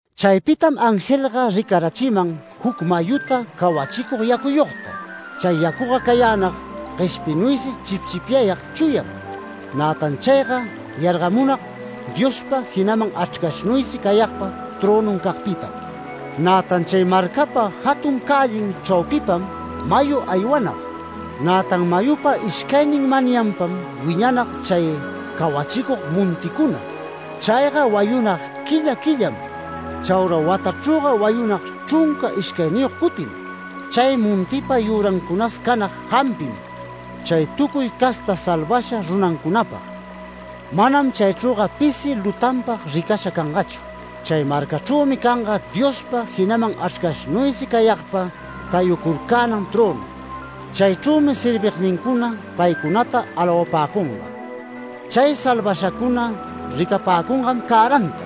Chaypitam angelga ricarachiman juc mayuta cawachicug yacuyogta. Chay yacuga cayänag gueshpinuysi chipchipyag chuyam. Nätan chayga yargamunag Diospa, jinaman Achrcashnuysi cayagpa trönuncagpitam. Nätan chay marcapa jatun cällin chraupipam mayu aywanag, nätan mayupa ishcaynin manyanpam wiñanag chay cawachicug monticuna. Chayga wayunag quilla quillam, chaura watachrüga wayunag chrunca ishcayniyog cutim. Chay montipa yürancunas canag jampim chay tucuy casta salvasha runancunapag. Manam chaychrüga pisi lutanpag ricasha cangachu. Chay marcachrümi canga Diospa, jinaman Achrcashnuysi cayagpa tayucurcänan trönu. Chaychrümi servignincuna paycunata alawapäcunga. Chay salvashacuna ricapäcungam cäranta,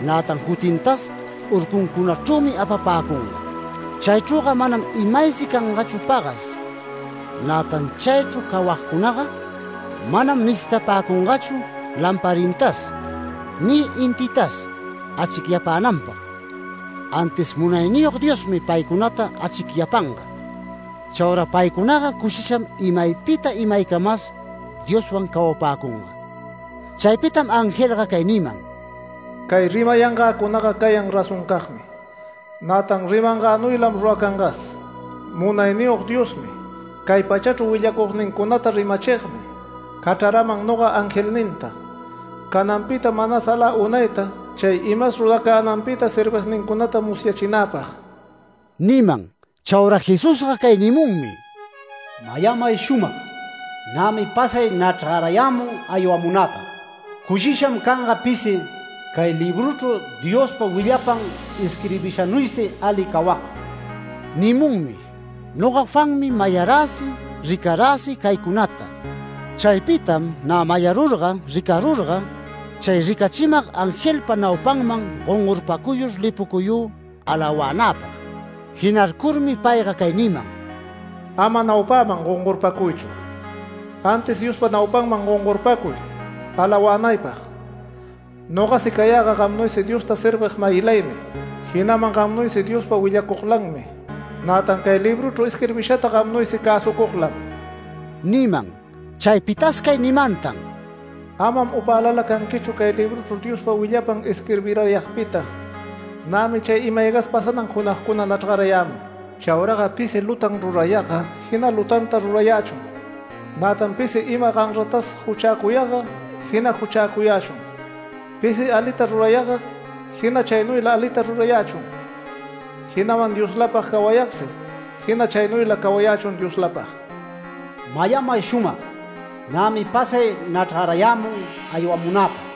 nätan jutintas urcuncunachrümi apapäcunga. Chaychrüga manam imaysi cangachu pagas, nätan chaychru cawagcunaga manam necitapäcungachu lamparintas, ni intitas achicyapänanpag, antis Munayniyog Diosmi paycunata achicyapanga. Chaura paycunaga cushisham imaypita imaycamas Dioswan cawapäcunga. Chaypitam angelga cay niman: “Cay rimayangäcunaga cayan razoncagmi, nätan rimangänuylam ruracangas. Munayniyog Diosmi, cay pachachru willacugnincunata rimachigmi cachraraman noga angelninta, cananpita manas alä unayta chay imas ruracänanpita servignincunata musyachinäpag” niman. Chaura Jesusga cay nimunmi: “Mayamay shumag: ¡Nämi pasay nachrgarayämun aywamunäpag! Cushisham canga pisi cay libruchru Diospa willapan isquirbishanuysi ali cawagga” nimunmi. Noga Juanmi, mayaräsi ricaräsi caycunata. Chaypitam nä mayarurga ricarurga, chay ricachimag angelpa naupanman gongorpacuyur lipucuyü alawänäpag. Jinarcurmi payga cay niman: “Ama naupäman gongorpacuychu, antis Diospa naupanman gongorpacuy alawänaypag. Nogasi cayäga gamnuysi Diosta servig-mayilaymi, jinaman gamnuysi Diospa willacuglanmi, nätan cay libruchru isquirbishata gamnuysi cäsucuglam” niman. Chaypitas cay nimantan: “Amam upälala canquichu cay libruchru Diospa willapan isquirbirayagpita. Nämi chay ima-aygas pasanan junagcuna nachrgayämun. Chauraga pisi lutan rurayagga jina lutanta rurayächun, nätan pisi ima ganratas juchäcuyagga jina juchäcuyächun. Pisi alita rurayagga, jina chaynuyla alita rurayächun, jinaman Dioslapag cawayagsi jina chaynuyla cawayächun Dioslapag. Mayamay shumag: Nämi pasay nachrgarayämun aywamunäpag,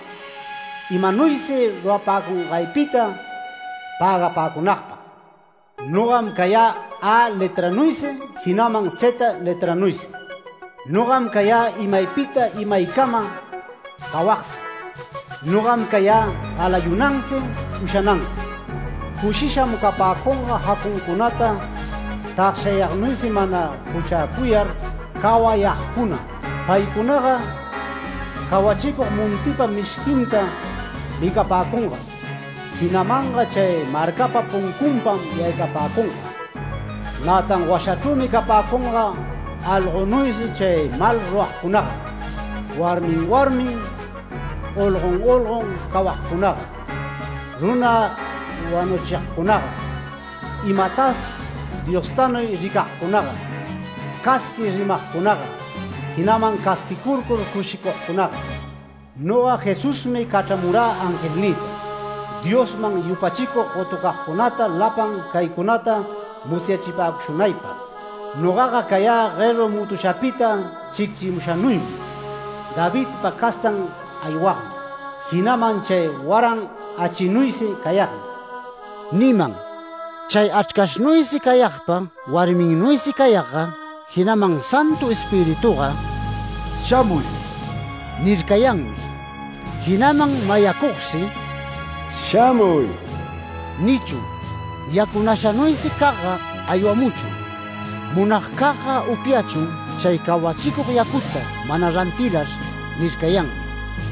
imanuysi rurapäcungaypita pägapäcunagpag. Nogam cayä A letranuysi, jinaman zeta letranuysi. Nogam cayä imaypita imaycama cawagsi. Nogam cayä galayunansi ushanansi. Cushisham capäcunga jacuncunata tagshayagnuysi mana juchäcuyar cawayagcuna. Paycunaga cawachicug montipa mishquinta micapäcungam, jinamanga chay marcapa puncunpam yaycapäcunga. Nätan washachrümi capäcunga algonuysi chay mal ruragcunaga, warmin warmin, olgon olgon cawagcunaga, runa wanuchigcunaga, imatas Diostanuy ricagcunaga, casqui rimagcunaga, jinaman casquicur cushicugcunaga. Noga Jesusmi, cachramurä angelnïta, Diosman yupachicug gotucagcunata lapan caycunata musyachipäcushunaypag. Nogaga cayä gueru mutushapita chicchimushanuymi, Davidpa castan aywagmi, jinaman chay waran achinuysi cayagmi” niman. Chay Achrcashnuysi cayagpa warminnuysi cayagga, jinaman Santu Espirituga “Shamuy” nircayanmi. Jinaman mayacugsi “Shamuy” nichun. “Yacunashanuysi cagga aywamuchun. Munagcagga upyachun chay cawachicug yacuta mana rantilar” nircayanmi.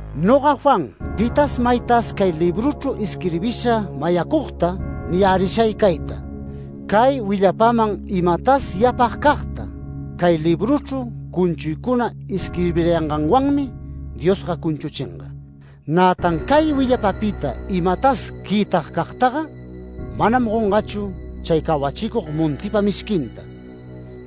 Noga Juan pitas maytas cay libruchru isquirbisha mayacugta niyärishay cayta: Cay willapaman imatas yapagcagtaga cay libruchru cunchuycuna isquirbirayanganwanmi Diosga cunchuchinga. Nätan cay willapapita imatas quïtagcagtaga, manam gongachu chay cawachicug montipa mishquinta,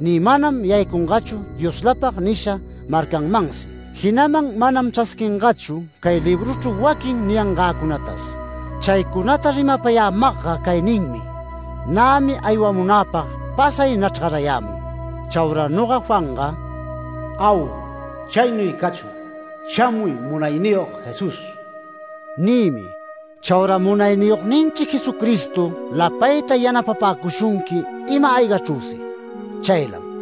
ni manam yaycungachu ‘Dioslapag’ nisha marcanmansi jinaman manam chrasquingachu cay libruchru waquin niyangäcunatas. Chaycunata rimapayämagga cay ninmi: “Nämi aywamunäpag pasay nachrgarayämun”. Chaura noga Juanga: “Au. Chaynuy cachun, shamuy Munayniyog Jesús” nïmi. Chaura Munayniyogninchi Jesucristo lapayta yanapäcushunqui ima-aygachrüsi. Chaylam.